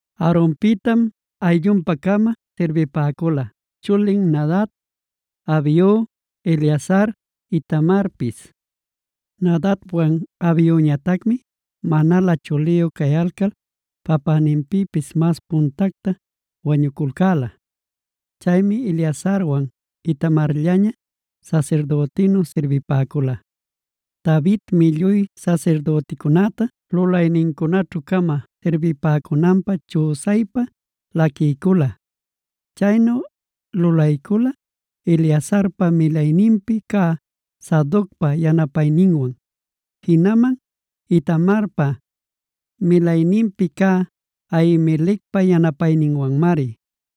Aaronpïtam ayllunpa-cama sirbipäcula: chulin Nadab, Abiu, Eleazar, Itamarpis. Nadabwan Abiuñatacmia manalä chuliyu cayalcal papäninpïpis mas puntacta wañuculcäla. Chaymi Eleazarwan Itamarllaña sasirdütinu sirbipäcula. Davidmi lluy sasirdüticunäta lulaynincunaćhu-cama sirbipäcunanpä chüsaypa laquiycula. Chaynu lulaycula Eleazarpa milayninpi cä Sadocpa yanapayninwan, jinaman Itamarpa milayninpi cä Ahimelecpa yanapayninwanmari.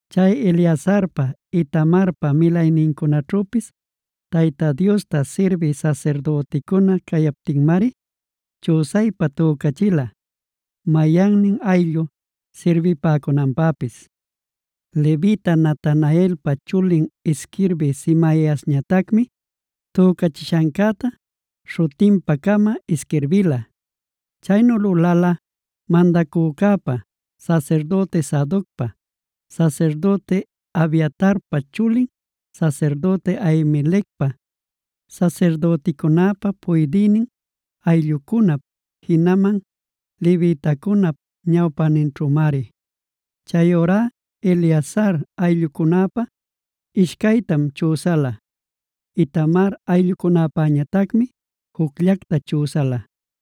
Chay Eleazarpa, Itamarpa milaynincunaćhüpis Tayta Diosta sirbï sasirdüticuna cayaptinmari, chüsaypa tücachila mayannin ayllu sirbipäcunanpäpis. Levita Natanaelpa chulin isquirbï Semaiasñatacmi tücachishancäta śhutinpa-cama isquirbila. Chaynu lulala mandacücäpa, sasirdüti Sadocpa, sasirdüti Abiatarpa chulin sasirdüti Ahimelecpa, sasirdüticunäpa puydïnin ayllucunap, jinaman levitacunap ñawpäninćhümari. Chayurá Eleazar ayllucunäpä ishcaytam chüsala; Itamar ayllucunäpañatacmi jucllacta chüsala.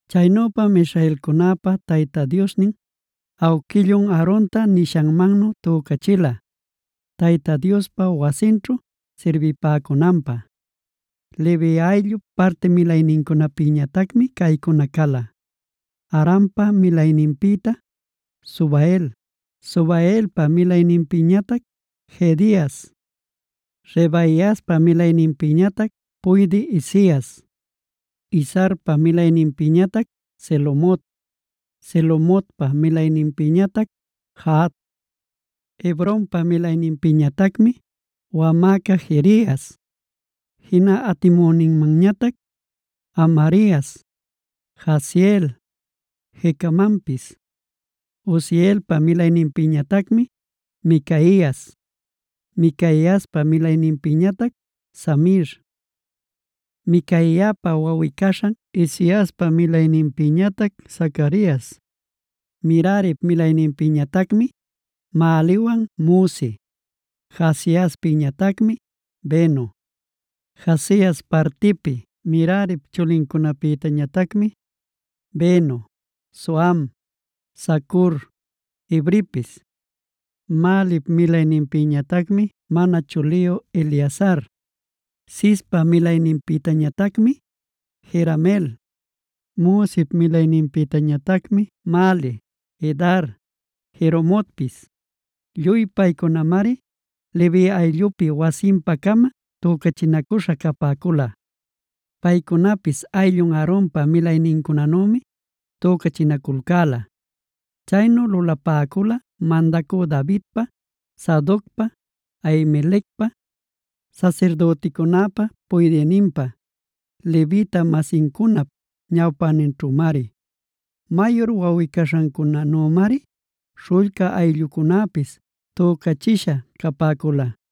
Chaynüpam israelcunäpa Tayta Diosnin awquillun Aaronta nishanmannu tücachila Tayta Diospa wasinćhu sirbipäcunanpä. Levi ayllup parti milaynincunapïñatacmi caycuna cala: Amrampa milayninpïta Subael, Subaelpa milayninpïtañatac Jehedias, Rehabiaspa milayninpïñatac puydï Isias, Izharpa milayninpïñatac Selomot, Selomotpa milayninpïñatac Jahat. Hebronpa milayninpïñatacmi: wamäca Jerias, jina atimüninmanñatac Amarias, Jahaziel, Jecamanpis. Uzielpa milayninpïñatacmi Micaias, Micaiaspa milayninpïñatac Samir, Micaiapa wawꞌi-caśhan Isiaspa milayninpïñatac Zacarias. Merarip milayninpïñatacmi Mahliwan Musi, Jaaziaspïñatacmi Beno. Jaazias partipi Merarip chulincunapïtañatacmi: Beno, Soham, Zacur, Ibripis. Mahlip milayninpïñatacmi mana chuliyu Eleazar. Cispa milayninpïtañatacmi Jerameel. Musip milayninpïtañatacmi: Mahli, Edar, Jerimotpis. Lluy paycunamari Levi ayllupi wasinpa-cama tücachinacuśha capäcula. Paycunapis ayllun Aaronpa milaynincunanümi tücachinaculcäla. Chaynu lulapäcula mandacü Davidpa, Sadocpa, Ahimelecpa, sasirdüticunäpa puydïninpa, levita-masincunap ñawpäninćhümari. Mayur wawꞌi-caśhancunanümari śhullca ayllucunäpis tücachisha capäcula.